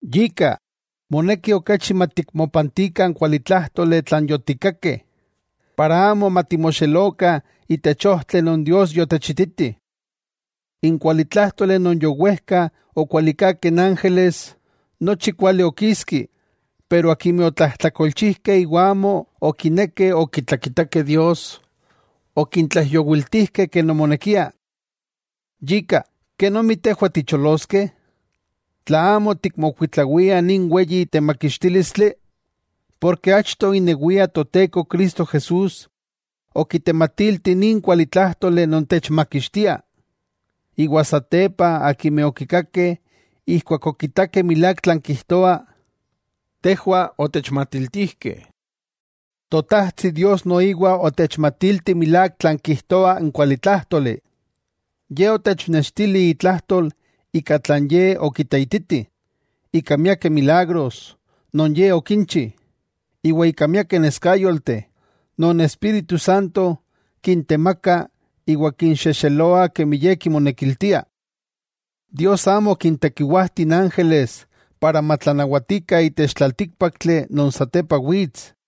Yika, moneki okachi matikmopantikah n kualitlájtoli tlan yotikakeh, para amo matimoxelokah itech ojtli non Dios yotechititi. N kualitlájtoli non yowejka okualikakeh n ángeles, nochi kuali okiski, pero akimeh otlajtlakolchijkeh iwa amo okinekeh okitlakitakeh Dios, okintlaijyowiltijkeh ken omonekia. Yika, ¿kenomi tejwah ticholoskeh, tla amo tikmokuitlawiah nin weyi temakixtílistli? Porke achto inewia Toteko Cristo Jesús okitematilti nin kualitlájtoli non techmakixtia, iwa satepa akimeh okikakeh ijkuak okitakeh milák tlan kijtoa, tejwah otechmatiltijkeh. Totajtsi Dios noiwa otechmatilti milák tlan kijtoa n kualitlájtoli. Ye otechnextili itlajtol ika tlan Ye okiteititi, ika miaktikeh milagros non Ye okinchi, iwa ika miakeh neskayolteh non Espíritu Santo kintemaka iwa kinxejxeloa kemi Ye kimonekiltia. Dios amo okintekiwajti n ángeles para matlanawatikah itech tlaltíkpaktli non satepa wits.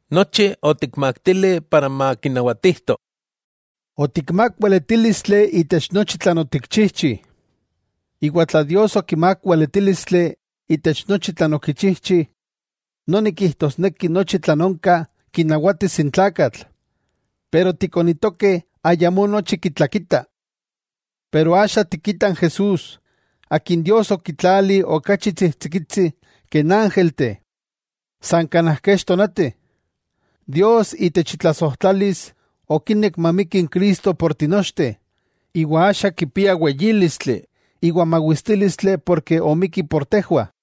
Nochi otikmaktili makinawatijto. Otikmák weletílistli itech nochi tlan otikchijchi. Iwa tla Dios okimák weletílistli itech nochi tlan okichijchi, noni kijtosneki nochi tlan onka kinawatis n tlakatl, pero tikonitokeh ayamó nochi kitlakitah. Pero axa tikitah n Jesús, akin Dios okitlali okachi tsijtsikitsi ke n ángelteh san kanaj kech tonati. Dios itech itlasojtlalis okinek mamiki n Cristo por tinochteh, iwa axa kipia weyílistli iwa mawistílistli porke omikki por tejwah.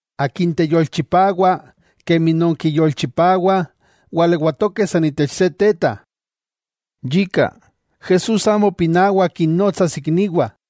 Akin teyolchipawa kemi non kiyolchipawah walewatokeh san itech se teta. Yika Jesús amo pinawa kinnotsas ikniwah.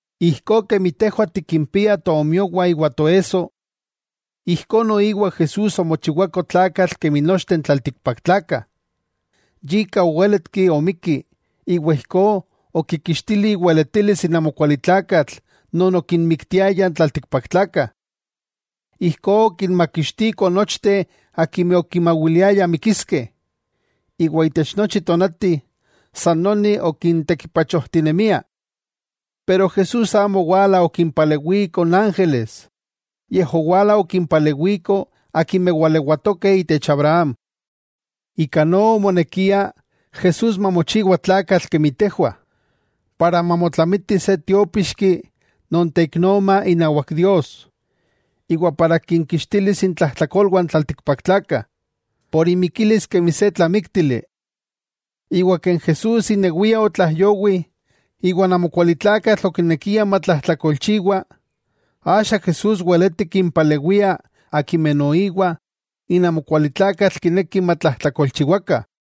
Ijkó kemi tejwah tikpiah tonakayo iwa toesso. Ijkó noiwa Jesús omochiwako tlakatl kemi nochteh n tlaltikpaktlakah. Yika owéletki omikki iwa ijkó okikixtili iweletilis n amokualitlakatl non okinmiktiaya n tlaltikpaktlakah. Ijkó okinmakixtiko nochteh akimeh okimawiliayah mikiskeh, iwa itech nochi tonati san noni okintekipachojtinemia. Pero Jesús amo owala okimpalewiko n ángeles, yej owala okimpalewiko akimeh walewatokeh itech Abraham. Ika no omonekia Jesús mamochiwa tlakatl kemi tejwah, para mamotlamiti se Tiópixki non teiknoma inawak Dios, iwa para kinkixtilis intlajtlakolwah n tlaltikpaktlakah, por imikilis kemi se tlamíktili. Iwa ken Jesús inewia otlaijyowi iwa n amokualitlakatl okinekia matlajtlakolchiwa, axa Jesús weleti kimpalewia akimeh noiwa n amokualitlakatl kineki matlajtlakolchiwakah.